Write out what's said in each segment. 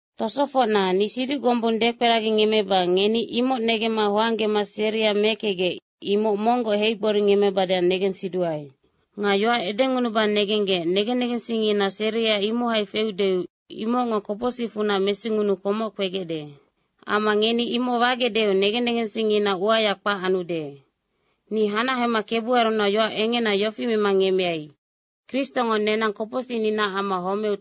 Tosofocna, ni siduc gombung dekperagingemmeba ngeni imoc negemma hoanggema seria mekecgec, imoc monggoc heigboringemmebadeac negensiduae. Nga yoac edengunuba negenggec negen negensingngina seria imohai feudeu imocngo kopocsicfunac mesingunuu komoc kpegecde. Amma ngeni imoc wagecdeu negen negensingngina uaya kpac anude. Ni hanahema Kebuarunac yoac engena yofi mema ngemmeai, Kristongo nenang kopocsicninaac amma homeu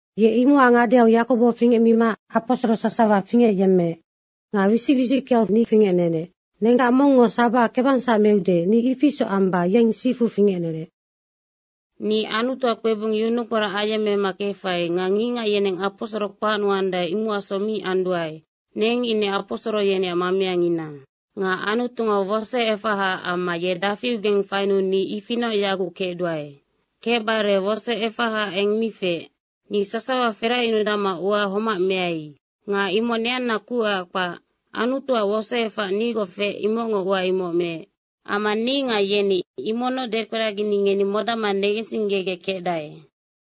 Ye imocac ngadeau Yakobo fingecmima aposoro sasawa fingecyemmeec. Nga wisic wisickeau fingecnenec. Nenggac mongngo sabaha kebangsac meude, ni ifi isoc amba yeng sifu fingecnenec. Ni Anutuac kpebung yunukporac ayemmemma kefai nga ngicngac yeneng aposoro kpacnuandae, imocacsoc mi anduae, neng ine aposoro yeneac mameangina. Nga Anutungo wosoefahaac amma ye dafiugeng fainuu ni ifianoc yaguc kecduae. Kecbare wosoefaha eng mi feec. Ni sasawa feracyunudacma ua homac meai. Nga imoc neanna kucac kpac, Anutuac wosoefac nigoc feec, imocngo ua imoc meec. Amma ni nga yeni imocnoc dekperagini ngeni modacma negensinggegec kecdae.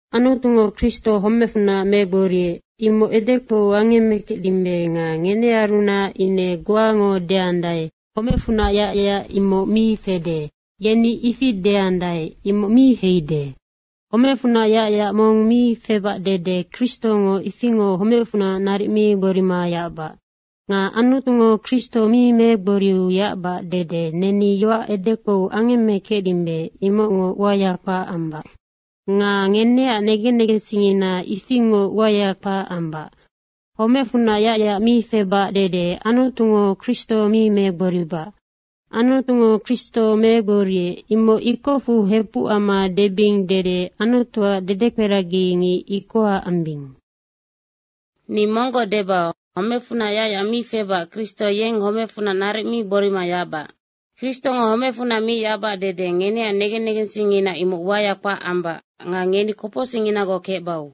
Anutungo Kristo homecfunac megboriec, imoc edekpou angemmekecdimbe nga ngenearunac ine goango deandae, “Homecfunac yacyac imoc mi fede.” yeni ifi deandae, imoc mi heide. Homecfunac yacyac mong mi febac dede Kristongo ifingoc homecfunac naric mi gborima yacbac. Nga Anutungo Kristo mi megboriu yacbac dede neni yoac edekpou angemmekecdimbe, imocngo uaya kpac ambac nga ngeneac negen negensingngina ifingoc uaya kpac ambac. Homecfunac yacyac mi febac dede Anutungo Kristo mi megboribac, “Anutungo Kristo megboriec.” imoc ikocfu hepuc amma debing dede Anutuac dedekperagingic ikoha ambing. Ni monggoc deba, homecfunac yacyac mi febac Kristo yeng homecfunac naric mi gborima yacbac. Kristongo homecfunac mi yacbac dede ngeneac negen negensingngina imoc uaya kpac ambac nga ngeni kopocsicnginagoc kecbau.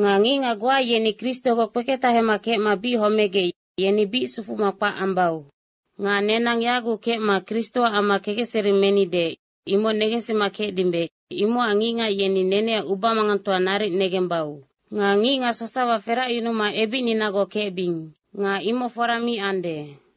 Nga ngicngac goa yeni Kristogoc kpeketahema kecma bic homegec, yeni bic sufuma kpac ambau. Nga nenang yaguc kecma Kristoac amma kekecseri menide, imoc negensima kecdimbe, imocac ngicngac yeni neneac ubamangangtoa naric negembau. Nga ngicngac sasawa feracyunuma ebicninagoc kecbing. Nga imoc fora mi ande.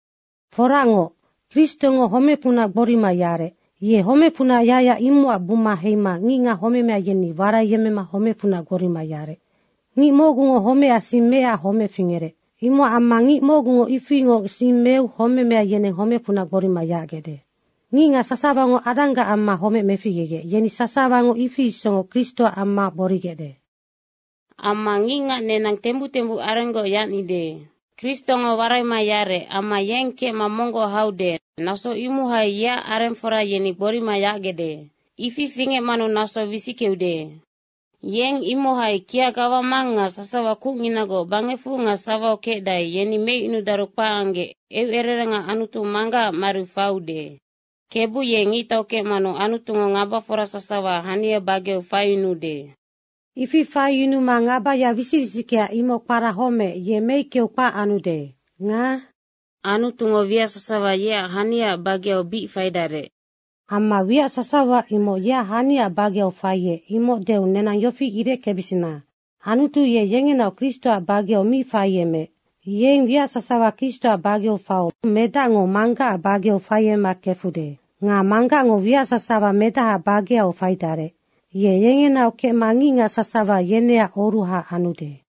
Foracngoc, Kristongo homecfunac gborima yarec. Ye homecfunac yacyac imocac buma heima ngicngac homemea yeni waraiyemmema homecfunac gborima yarec. Ngic mocgungo homecac sing meecac homec fingerec. Imocac amma ngic mocgungo ifingoc sing meu homemea yeneng homecfunac gborima yacgecde. Ngicngac sasawango Adanggac amma homec meficgegec yeni sasawango ifi isocngoc Kristoac amma gborigecde. Amma ngicngac nenang tembuc tembuc arenggoc yacnide. Kristongo waraima yarec amma yeng kecma monggoc haude, naso imohai yeac arengfora yeni gborima yacgecde. Ifi fingecmanu naso wisickeude. Yeng imohai kia gawamang nga sasawa kucnginagoc bangecfu nga sawau kecdae, yeni meicyunudaru kpac anggec eucererenga Anutu Manggacac mariu faiude. Kebu ye ngictau kecmanu Anutungo ngabafora sasawa hania bageau faiyunuude. Ifi faiyunuma ngabaya wisic wisickea, imoc kpara homec, ye meickeu kpac anude. Nga “Anutungo wiac sasawa yeac haniaac bageu bic faidarec.” Amma “Wiac sasawa.” imoc yeac haniaac bageu faiec, imoc deu nenang yofi ireckebisina, Anutu ye yengenaoc Kristoac bageu mi faiemeec. Yeng wiac sasawa Kristoac bageu faiu Medacngo Manggacac bageu faiemema kefude. Nga Manggacngo wiac sasawa Medahaac bageau faidarec, ye yengenaocngoc kecma ngicngac sasawa yeneac oruha anude.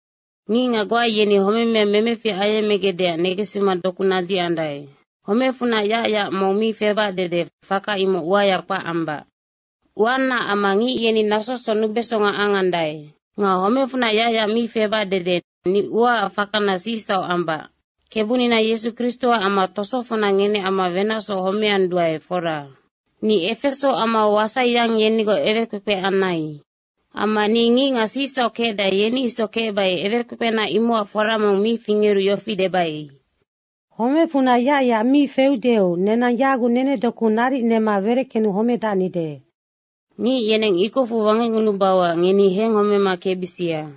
Ngicngac goa yeni homemea memefic ayemmegecdeac negensima doku nadzicandae. Homecfunac yacyac mong mi febac dede faka imoc uaya kpac ambac. Uanaac amma ngic yeni nasosoc nubesonga angandae. Nga homecfunac yacyac mi febac dede ni uaac fakana sicsauc ambac. Kebunina Yesu Kristoac amma tosofocna ngeneac amma wenacsoc homeanduae, fora. Ni Efeso amau wasaiyang yenigoc ewekpekpe anai. Amma ni ngicngac sicsauc kecdae, yeni isoc kecbai ewekpekpena imocac fora mong mi fingeru yofi debai, “Homecfunac yacyac mi feudeu nenang yaguc nenedoku naric nema wereckenu homedacnide.” Ngic yeneng ikocfu wangecngunubauac ngeni henghomema kecbisia.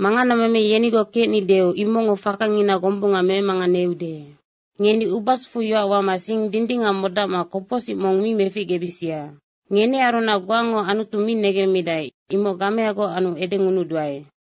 Manganameme yenigoc kecnideu imocngo fakanina gombunga memanganeude. Ngeni ubasufu yoac wama sing dindingac modacma kopocsic mong mi meficgebisia. Ngenearunac goango Anutu mi negemmidae, imoc gameagoc anu edengunuduae.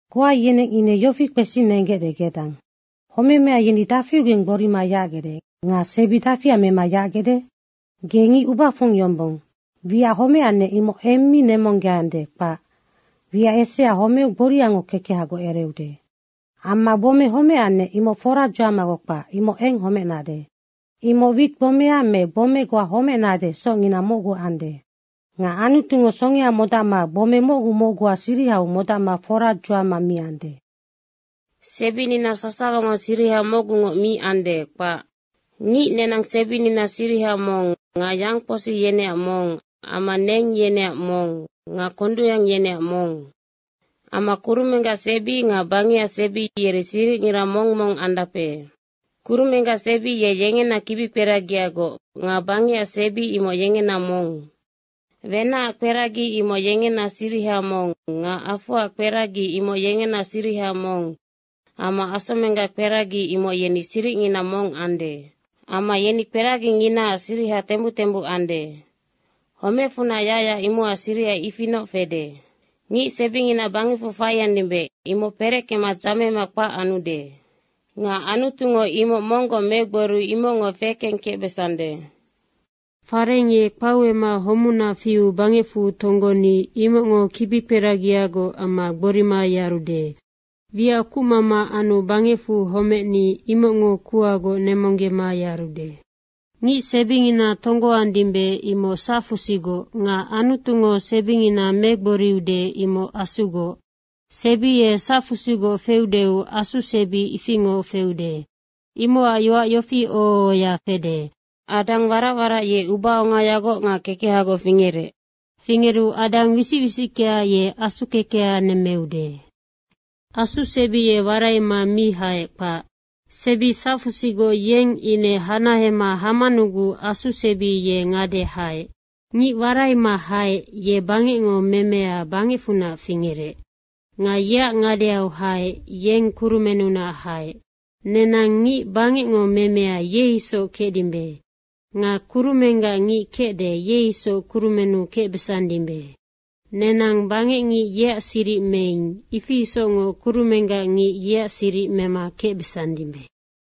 Goa yeneng ine yofi kpesigecde gedang, “Homemea yeni dafiugeng gborima yacgecde nga sebi dafia mema yacgecde?” Ge ngic ubafong yombong. Wiac homecannec, imoc eng mi nemonggeande, kpac. Wiac esea homeu gboriango kekehagoc ereude. Amma gbome homecannec, imoc foradzuamagoc kpac, imoc eng homecnade. Imoc wit gbomea me gbome goa homecnade socngina mocgu ande. Nga Anutungo songea modacma gbome mocgu mocguac sirihau modacma foradzuama miande. Sebinina sasawango siriha mocgungoc mi ande, kpac. Ngic nenang sebinina siriha mong nga yangkposi yeneac mong amma neng yeneac mong nga kondungyang yeneac mong. Amma kurumenggac sebi nga bangecac sebi, yeri siricngira mong mong andape. Kurumenggac sebi ye yengena kibikperagiagoc nga bangecac sebi imoc yengena mong. Wenacac kperagi imoc yengena siriha mong nga afoac kperagi imoc yengena siriha mong amma asomenggac kperagi, imoc yeni siricngina mong ande. Amma yeni kperaginginaac siriha tembuc tembuc ande. Homecfunac yacyac, imocac siriha ifinoc fede. Ngic sebingina bangecfu faiandimbe, imoc pereckema dzamema kpac anude. Nga Anutungo imoc monggoc megboriu imocngo fekengkecbesande. Fareng ye kpauema homuna fiu bangecfu tonggoni, imocngo kibikperagiagoc amma gborima yarude. Wiac kucmama anu bangecfu homecni, imocngo kuhagoc nemonggema yarude. Ngic sebingina tonggoandimbe, imoc sacfusigoc nga Anutungo sebingina megboriude imoc asugoc. Sebi ye sacfusigoc feudeu asu sebi ifingoc feude. Imocac yoac yofi oho ohoya fede, “Adang warac warac, ye ubaongayagoc nga kekehagoc fingerec.” Fingeru Adang wisic wisickea, ye asu kekeha nemmeude. Asu sebi ye waraima mi haec, kpac. Sebi sacfusigoc yeng ine hanahema hamanuguc asu sebi ye ngade haec. Ngic waraima haec, ye bangecngo memea bangecfunac fingerec. Nga yeac ngadeau haec, yeng kurumennunac haec. Nenang ngic bangecngo memea, ye isoc kecdimbe. Nga kurumenggac ngic kecde, ye isoc kurumennu kecbesandimbe. Nenang bangecngic yeac siric meing, ifi isocngoc kurumenggac ngic yeac siric mema kecbesandimbe.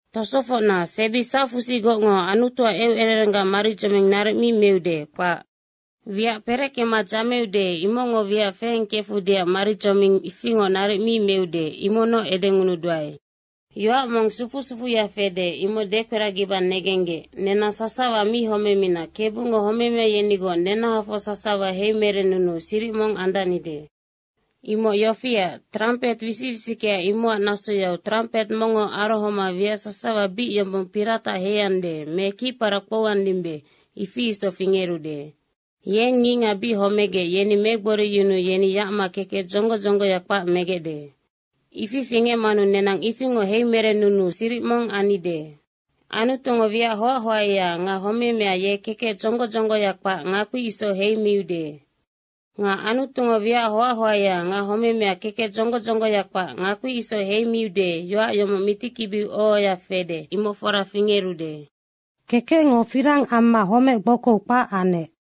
Tosofocna, sebi sacfusigocngo Anutuac eucererenggac maridzoming naric mi meude, kpac. Wiac pereckema dzameude, imocngo wiac fekengkefudeac maridzoming ifingoc naric mi meude, imocnoc edengunuduae. Yoac mong sufu sufuya fede, imoc dekperagiba negenggec, nenang sasawa mi homemina Kebungo homemea yenigoc nenahafoc sasawa heimerennunuu siric mong andacnide. Imoc yofiac, trampet wisic wisickea imocac nasoyau trampet mongngo arohomanu wiac sasawa bic yombong piratac heiande me kicparac kpouandimbe, ifi isoc fingerude. Yeng ngicngac bic homegec, yeni megboriyunuu yeni yacma kekec dzonggo dzonggoya kpac megecde. Ifi fingecmanu nenang ifingoc heimerennunuu siric mong annide. Anutungo wiac hoac hoaea nga homemea ye kekec dzonggo dzonggoya kpac ngakpi isoc heimiude. Nga Anutungo wiac hoac hoaea nga homemea kekec dzonggo dzonggoya kpac ngakpi isoc heimiude, yoac yomoc mitikibiu oho ohoya fede, imoc fora fingerude, “Kekecngo firang amma homec gbokou kpac anec.”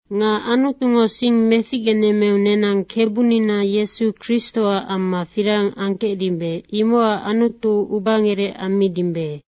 Nga Anutungo sing meficgenemmeu nenang Kebunina Yesu Kristoac amma firang angkecdimbe, imocac Anutu ubangerec ammidimbe.